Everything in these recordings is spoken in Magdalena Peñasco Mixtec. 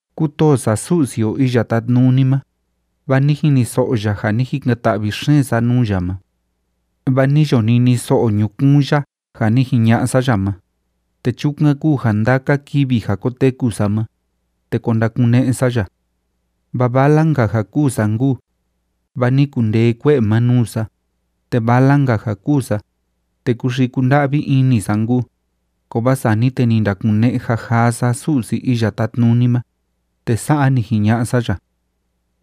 Kútoo sa Su'si o Iya Tátnuni ma, vaa ni jiniso'o ya ja ni jikan‑ta'vi xeen sa nuu ya ma. Vaa ni yo niniso'o ñukuun ya ja ni jiña'a sa ya ma, te chukan kúu ja ndaka kivi ja koteku sa ma, te ko ndakune'e sa ya. Vaa vala‑nka ja kûu sa nkuu, vaa ni kundee kue'e ma nuu sa, te vala‑nka ja kûu sa, te kúxii kúnda'vi ini sa nkuu. Kovaa sani te ni ndakune'e jajaa sa Su'si Iya Tátnuni ma, te sa'a ni jiña'a sa ya: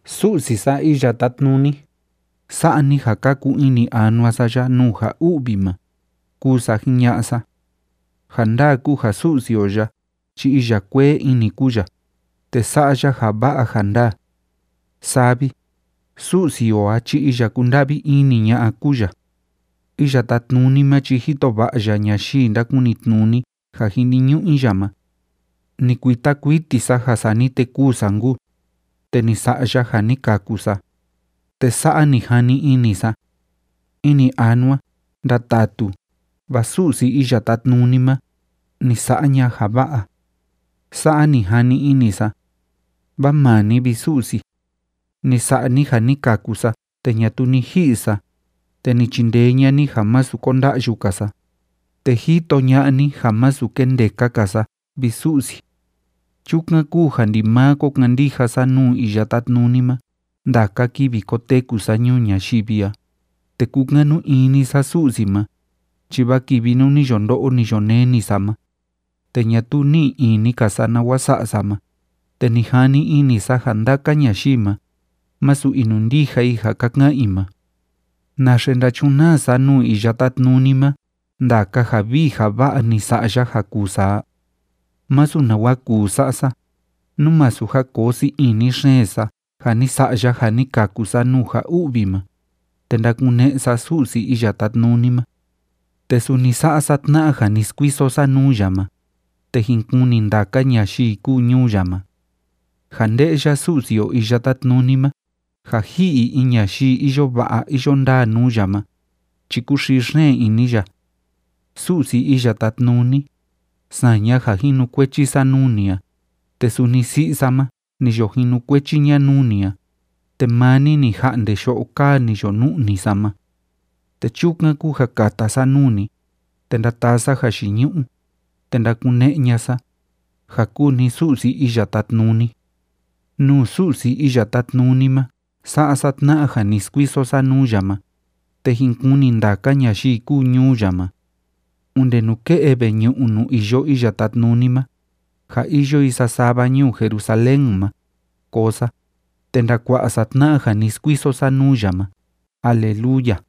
“Su'si sa Iya Tátnuni, sa'a ni ja kaku ini anua sa ya nuu ja u'vi ma”, kúu sa jiña'a sa. Ja ndaa kúu ja Su'si o ya chi iya kuee ini kúu ya, te sa'a ya ja va'a ja ndaa. Saa vi, Su'si o a chi iya kúnda'vi ini ña'a kúu ya. Iya Tátnuni ma chi jito va'a ya ñayii ndákunitnuni ja jiniñu'u i ya ma. Ni kuita kuiti sa ja sani te kûu sa nkuu, te ni sa'a ya ja ni kaku sa. Te sa'a ni jani ini sa: “Ini anua, ndatatu, vaa Su'si Iya Tátnuni ma, ni sa'a ña'a ya ja va'a.” Sa'a ni jani ini sa. Vaa maa ni, vi Su'si, ni sa'a ni ja ni kaku sa te ñatuu ni ji'i sa, te ni chindee ña'a ni ja masu konda'yu‑ka sa, te jito ña'a ni ja masu kendeka‑ka sa, vi Su'si. Chukan kúu ja ndimaa ko kandija sa nuu Iya Tátnuni ma ndaka kivi koteku sa ñuu ñayivi a, te kúkanu ini sa Su'si ma. Chi vaa kivi nuu ni yo ndo'o, ni yo neni sa ma, te ñatuu ni'i ini‑ka sa nawa sa'a sa ma, te ni jani ini sa ja ndaka ñayii ma, masu inundija i ja ka ka'an i ma. ¿Naxe ndachunaa sa nuu Iya Tátnuni ma ndaka ja vii ja va'a ja ni sa'a ya ja kuu sa a? Masu nawa kuu sa'a sa, nú masu ja koo sii ini xeen sa ja ni sa'a ya ja ni kaku sa nuu ja u'vi ma, te ndakune'e sa Su'si Iya Tátnuni ma. Te suni sa'a sa tna'a ja ni skuiso sa nuu ya ma, te jin kuni ndaka ñayii kúu ñuu ya ma. Ja nde'ya Su'si o Iya Tátnuni ma ja ji'i in ñayii iyo va'a iyo ndaa nuu ya ma, chi kúxii xeen ini ya. Su'si Iya Tátnuni, saña ja jinukuechi sa nuu ni a, te suni si'i sa ma, ni yo jinukuechi ña nuu ni a, te maa ni ni ja'nde yo'o kaa ni yo nu'ni sa ma. Te chukan kúu ja kata sa nuu ni, te ndataa sa jayiñu'u, te ndakune'e ña'a sa, ja kúu ni Su'si Iya Tátnuni. Nuu Su'si Iya Tátnuni ma sa'a sa tna'a ja ni skuiso sa nuu ya ma, te jin kuni ndaka ñayii kúu ñuu ya ma. Onde nuke'e veñu'u nuu iyo Iya Tátnuni ma, ja iyo i sasava ñuu Jerusalén ma, koo sa, te ndakua'a sa tna'a ja ni skuiso sa nuu ya ma. ¡Aleluya!